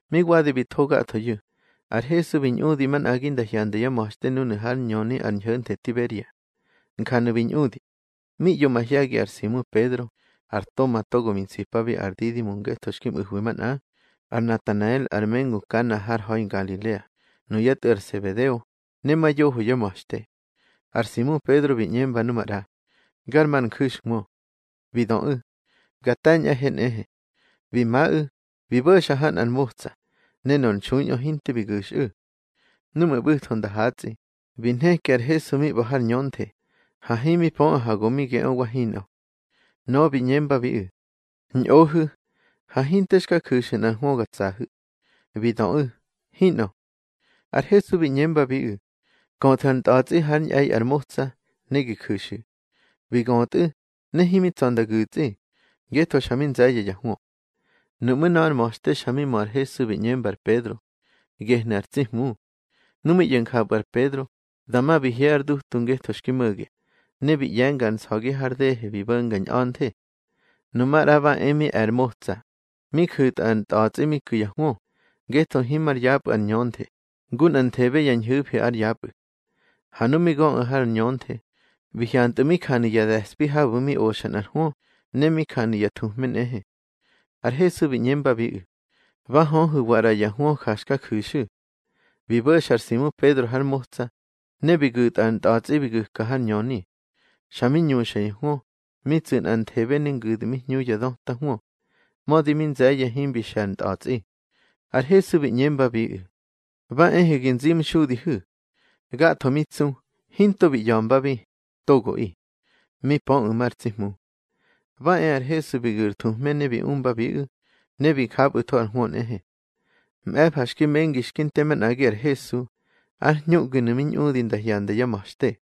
Mi wadi bi tho gathoyu̱, ar Hesu bi ñꞌudi manꞌagi nda hyanda yá ma̱xte núnu̱ hár ñöni ar ñho̱nthe Tiberia. Njanu̱ bi ñꞌudi: Mi ꞌyo mahye̱gi ar Simu Pedro, ar Toma togo mi nsipabi ar Didimo ngetho xki mꞌu̱hwi manꞌa, ar Natanael ar mengu Kana har ha̱i Ngalilea, nuyá tꞌu̱ ar Sebedeo, ne ma yoho yá ma̱xte. Ar Simu Pedro bi ꞌñemba nu maꞌra: —Gar ma ar nju̱xhwö. Bi döꞌu̱: —Ga te̱ñꞌahe nꞌehe. Bi maꞌu̱, bi bo̱xa ha nꞌar motsa, ne nor nxuiꞌö hinte bi gu̱xꞌu̱. Núꞌmu̱ ꞌbu̱tho nda hatsꞌi, bi nheki ar Hesu mi ꞌba̱ har ñönthe, ha himi pöꞌu̱ ha go mi geꞌö wa hinꞌö. Nöꞌö bi ꞌñembabiꞌu̱: —Ñꞌohu̱, ha hinte xka ju̱xu̱ nꞌar hwö ga tsahu̱. Bi döꞌu̱: —Hinꞌö. Ar Hesu bi ꞌñembabiꞌu̱: —Köthu̱ ar ntꞌa̱tsꞌi hár ñꞌe̱i ar motsa, ne gi ju̱xu̱. Bi götꞌu̱, ne himi tsa̱ nda gu̱tsꞌi, ngetho xa mi nze̱ye̱ ya hwö. Nuꞌmú̱ nöꞌö ar ma̱xte xa mi mö ar Hesu bi ꞌñemba ar Pedro: —Gehnu̱ ar tsi Hmu. Nu mi ꞌyo̱ njapꞌu̱ ar Pedro, dama bi hye ár dutu ngetho xki mo̱ge, ne bi ꞌye̱nga ar nsa̱gi har dehe bi bo̱nga ñꞌa̱nthe. Nu maꞌra ba e mi e̱ ar motsa, mi ju̱tꞌa ar ntꞌa̱tsꞌi mi ku̱ ya hwö, ngetho himar yapꞌu̱ ar ñönthe, ngu nꞌanthebe ya ñhu̱fi ár yapꞌu̱. Ha nu mi göꞌu̱ har ñönthe, bi hyantꞌu̱ mi janu̱ ya de̱spi habu̱ mi oxa nꞌar hwö, ne mi janu̱ ya thuhme nꞌehe. Ar Hesu bi ꞌñembabiꞌu̱: —Ba höhu̱wa ꞌra ya hwö ja xka ju̱xu̱. Bi bo̱xa ar Simu Pedro har motsa, ne bi gu̱tꞌa ar ntꞌa̱tsꞌi bi gu̱ka har ñöni. Xa mi ñuxa ya hwö, mi tsu̱ nꞌanthebe ne ngu̱dmihñu ya döta hwö. Mödi mi nze̱ye̱ himbi xe̱ ar ntꞌa̱tsꞌi. Ar Hesu bi ꞌñembabiꞌu̱: —Ba ehu̱ gi nzimxudihu̱. Gatho mi tsu, hinto bi ꞌya̱mbabi, togoꞌi. Mi pöꞌu̱ mar tsi Hmu. Ba e ar Hesu bi gu̱ ar thuhme ne bi umbabiꞌu̱, ne bi japꞌu̱tho ar hwö nꞌehe. Mꞌe̱fa xki mengi xki nte manꞌagi ar Hesu, ár hñuꞌginu̱ mi ñꞌudi nda hyanda yá ma̱xte.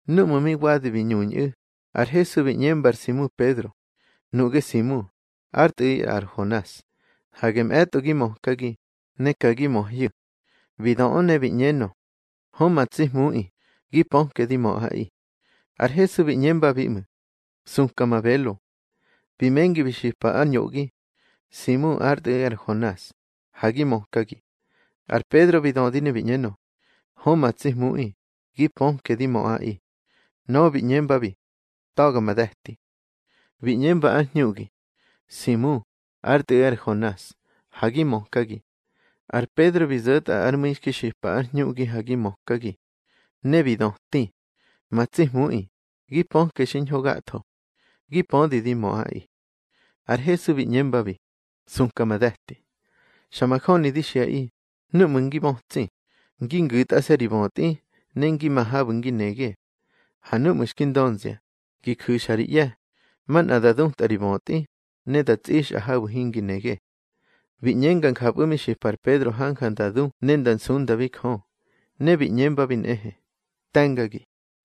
Núꞌmu̱ mi wadi bi ñuñꞌu̱, ar Hesu bi ꞌñemba ar Simu Pedro: —Nuꞌge Simu, ár Tꞌu̱ꞌi ar Honas, hage mꞌe̱tꞌo gi mökagi, ne ka gi möhyu̱. Bi doꞌö ne bi ꞌñenö: —Hö ma tsi Hmuꞌi, gi pöke di möꞌaꞌi. Ar Hesu bi ꞌñembabi ꞌmu̱: —Suka ma belo. Bi mengi bi xipa ár ñoꞌgi: —Simu, ár tꞌu̱ꞌi ar Honas, ha gi mökagi. Ar Pedro bi dödi ne bi ꞌñenö: —Hö ma tsi Hmuꞌi, gi pöke di möꞌaꞌi. Nöꞌö bi ꞌñembabi: —Ta̱ga ma de̱ti. Bi ꞌñemba ár hñuꞌgi: —Simu, ár Tꞌu̱ꞌi ar Honas, ha gi mökagi. Ar Pedro bi zo̱tꞌa ár mu̱i xki xipa ár hñuꞌgi, ha gi mökagi. Ne bi döti: —Ma tsi Hmuꞌi, gi pöke xiñho gatho. Gi pödi di möꞌaꞌi. Ar Hesu bi ꞌñembabi: —Suka ma de̱ti. Xa majöni di xiꞌaꞌi, núꞌmu̱ ngi bötsi, ngi ngu̱tꞌase̱ ri bötꞌi, ne ngi ma habu̱ ngi nege. Ha núꞌmu̱ xki ndönzia, gi ju̱xa ri ꞌye̱, manꞌa da dutꞌa ri bötꞌi, ne da tsꞌixꞌa habu̱ hingi nege. Bi ꞌñenga njapꞌu̱ mi xipa ar Pedro hanja nda du ne nda nsundabi Jö, ne bi ꞌñembabi nꞌehe: —Te̱ngagi.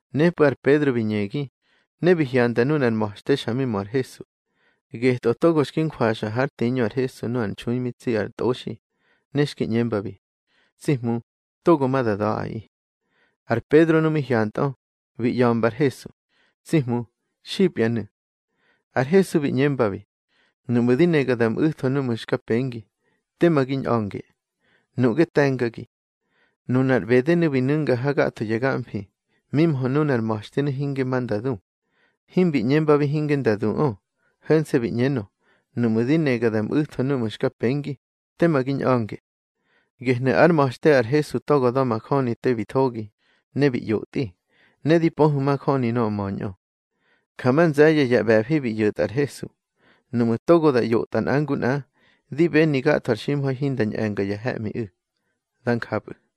Nepꞌu̱ ar Pedro bi ñegi, ne bi hyanda nunar ma̱xte xa mi mö ar Hesu. Getꞌö togo xki njwaxa hár tiñö ar Hesu nu ar nxui mi tsi ar tꞌoxi, ne xki ꞌñembabi: Tsi Hmu, togo ma da da̱ꞌaꞌi. Ar Pedro nu mi hyantꞌö, bi ꞌya̱mba ar Hesu: —Tsi Hmu, xipyanu̱. Ar Hesu bi ꞌñembabi: —Nuꞌmu̱ di nega da mꞌu̱tho núꞌmu̱ xka pengi, tema gi ñꞌa̱nge. Nuꞌge te̱ngagi. Nunar ꞌbedenu̱ bi nu̱nga ha gatho ya gamfi, mi mhö nunar ma̱xtenu̱ hinge ma nda du. Himbi ꞌñembabi hinge nda duꞌö, ho̱nse̱ bi ꞌñenö: Nuꞌmu̱ di nega da mꞌu̱tho núꞌmu̱ xka pengi, tema gi ñꞌa̱nge. Gehnu̱ ár ma̱xte ar Hesu togo da̱majöni te bi thogi, ne bi ꞌyotꞌi, ne di pöhu̱ majöni nöꞌö möñꞌö. Ja ma nze̱ye̱ ya ꞌbe̱fi bi ꞌyo̱tꞌa ar Hesu. Nuꞌmu̱ togo da ꞌyotꞌa nꞌa ngu nꞌa, di beni gatho ar ximha̱i hinda ñꞌe̱nga ya he̱ꞌmiꞌu̱. Dá njapꞌu̱.